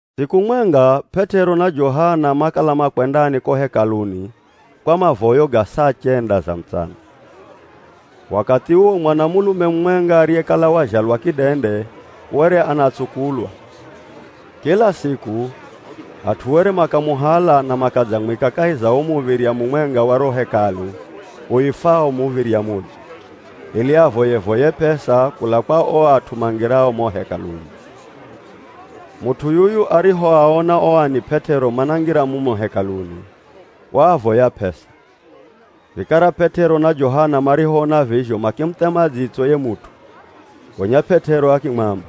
Siku mwenga P'et'ero na Johana makala makwendani ko Hekaluni kwa mavoyo ga saa chenda za mutsana. Wakathi uwo mwanamulume mumwenga ariyekala wazhalwa kidende were anatsukulwa. Kila siku, at'u were makamuhala na makadzamwika kahi za muv̱irya mumwenga wa ro Hekalu uifwao “Muv̱irya Mudzo,” ili avoye-voye p'esa kula kwa o at'u mangirao mo Hekaluni. Mut'u yuyu arihoaona o ani P'et'ero manangira mumo Hekaluni, waavoya p'esa. Vikara P'et'ero na Johana marihoona vizho makimuthema dzitso ye mut'u, gonya P'et'ero akimwamba,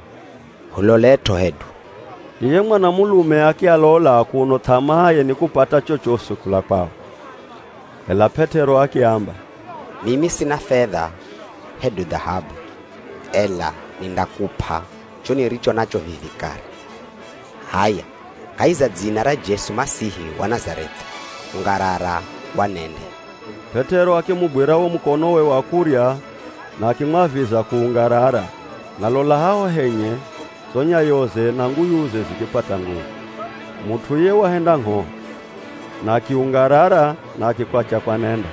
“Hulolet'o hedu!” Iye mwanamulume akialola kuno th'amaaye ni kupata chochosi kula kwao. Ela P'et'ero akiamba, “Mimi sina fedha hedu dhahabu, ela nindakup'a cho niricho nacho vivi kare. H'aya, kahi za dzina ra Jesu Masihi wa Nazareth'i, ungarara wanende!” P'et'ero akimugwira wo mukonowe wa kurya na akimwaviza kuungarara, na lola haho henye zo nyayoze na nguyuze zikipata nguvu. Mut'u iye wahenda ngh'o, na akiungarara na akikwatya kwanenda,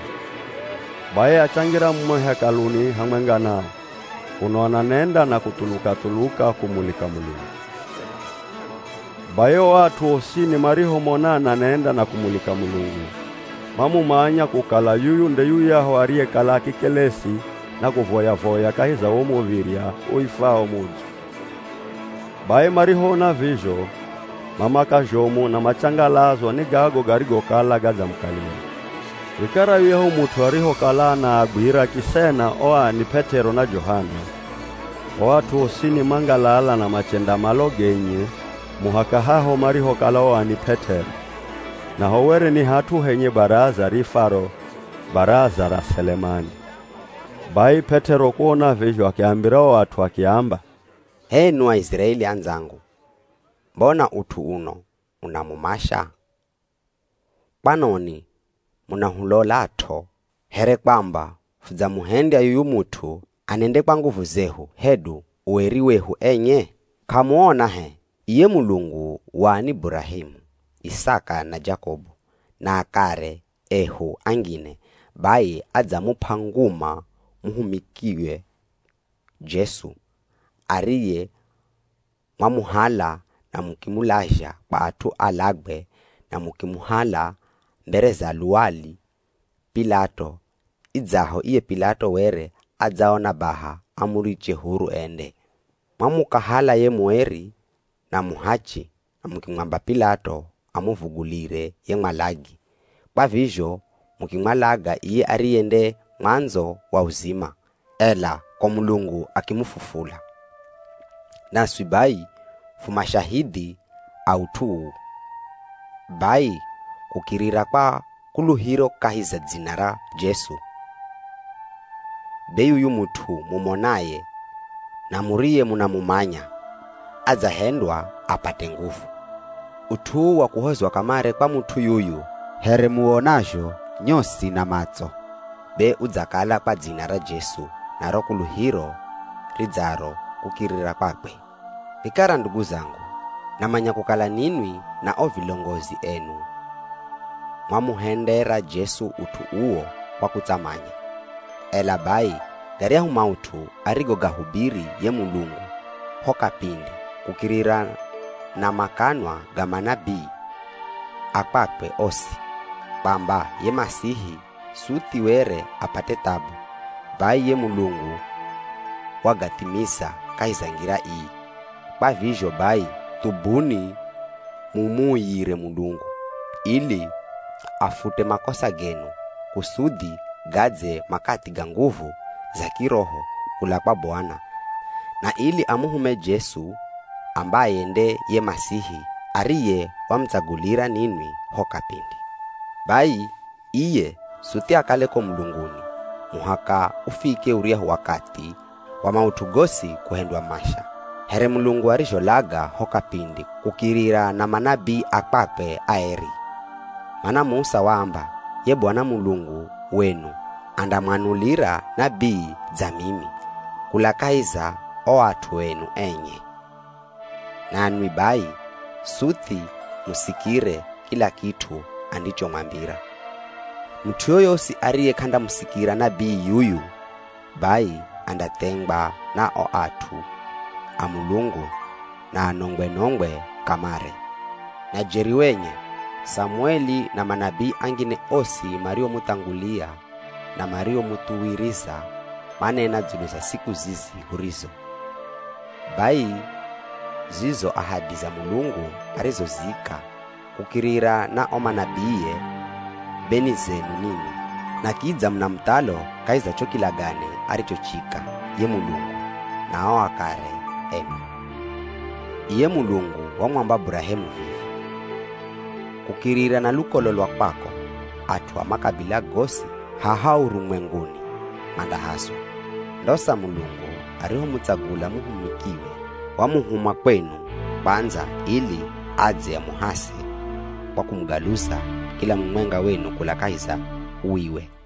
bai achangira mumo Hekaluni hamwenga nao, kuno ananenda na kuthuluka-thuluka kumulika Mulungu. Bai o at'u osini marihomona ananenda na kumulika Mulungu, mamumanya kukala yuyu nde yuyahu ariyekala akikelesi na kuvoya-voya kahi za wo muv̱irya uifwao “Mudzo.” Bai marihoona vizho mamaka zhomu na machangalazwa ni gago garigokala gadzamukalira. Vikara yuyahu mut'u arihokala anaagwira kisena o ani P'et'ero na Johana, o at'u osini mangalala na machenda malo genye muhaka haho marihokala o ani P'et'ero, naho were ni hat'u henye baraza riifwaro “Baraza ra Selemani.” Bai P'et'ero kuona vizho, akiambira o at'u akiamba, “H'enwi Aiziraeli andzangu, mbona ut'u uno unamumasha? Kwanoni munahulolat'o here kwamba fudzamuhendya yuyu mut'u anende kwa nguvu zehu hedu ueri wehu enye? K'amuona h'e, iye Mulungu wa ani Burahemu, Isaka na Jakobu, na akare ehu angine, bai adzamup'a nguma muhumikiwe Jesu ariye mwamuhala na mukimulazha kwa at'u alagwe na mukimukahala mbere za luwali P'ilato, idzaho iye P'ilato were adzaona baha amuriche huru ende. Mwamukahala ye mueri na muhachi na mukimwamba P'ilato amuvugulire ye mwalagi. Kwa vizho mukimwalaga iye ariye nde mwandzo wa uzima, ela ko Mulungu akimufufula. Naswi bai fu mashahidhi a ut'u uu. Bai kukirira kwa kuluhiro kahi za dzina ra Jesu, be yuyu mut'u mumonaye na muriyemunamumanya, adzahendwa apate nguvu. Ut'u uu wa kuhozwa kamare kwa mut'u yuyu here muwonazho nyosi na matso, be udzakala kwa dzina ra Jesu na ro kuluhiro ridzaro kukirira kwakwe. “Vikara ndugu zangu, namanya kukala ninwi na o vilongozi enu mwamuhendera Jesu ut'u uwo kwa kutsamanya. Ela bai garyahu maut'u arigogahubiri ye Mulungu ho kapindi kukirira na makanwa ga manabii a kwakwe osi, kwamba ye Masihi suthi were apate thabu, bai ye Mulungu wagathimiza kahi za ngira ii. Kwa vizho bai, thubuni mumuuyire Mulungu, ili afute makosa genu. Kusudhi gadze makathi ga nguvu za kiroho kula kwa Bwana na ili amuhume Jesu ambaye nde ye Masihi ariye wamutsagulira ninwi ho kapindi. Bai iye suthi akale ko mulunguni muhaka ufike uryahu wakathi wa maut'u gosi kuhendywa masha, here Mulungu arizholaga ho kapindi kukirira na manabii a kwakwe aeri. Mana Musa waamba, ‘Ye Bwana Mulungu wenu andamwanulira nabii dza mimi kula kahi za o at'u enu enye, nanwi bai suthi musikire kila kit'u andichomwambira. Mut'u yoyosi ariye k'andamusikira nabii yuyu bai andathengwa na o at'u a Mulungu na anongwe-nongwe kamare.’ “Na jeri wenye, Samueli na manabii angine osi mariomuthangulia na mariomuthuwiriza, manena dzulu za siku zizi hurizo. Bai zizo ahadi za Mulungu arizozika kukirira na o manabiie be ni zenu ninwi, na kidza muna muthalo kahi za cho kilagane arichochika ye Mulungu na o akare enu. Iye Mulungu wamwamba Burahemu vivi, ‘Kukirira na lukolo lwa kwako at'u a makabila gosi haha urumwenguni mandahaswa.’ Ndosa Mulungu arihomutsagula muhumikiwe, wamuhuma kwenu kwandza ili adze amuhase kwa kumugaluza kila mumwenga wenu kula kahi za uwiwe.”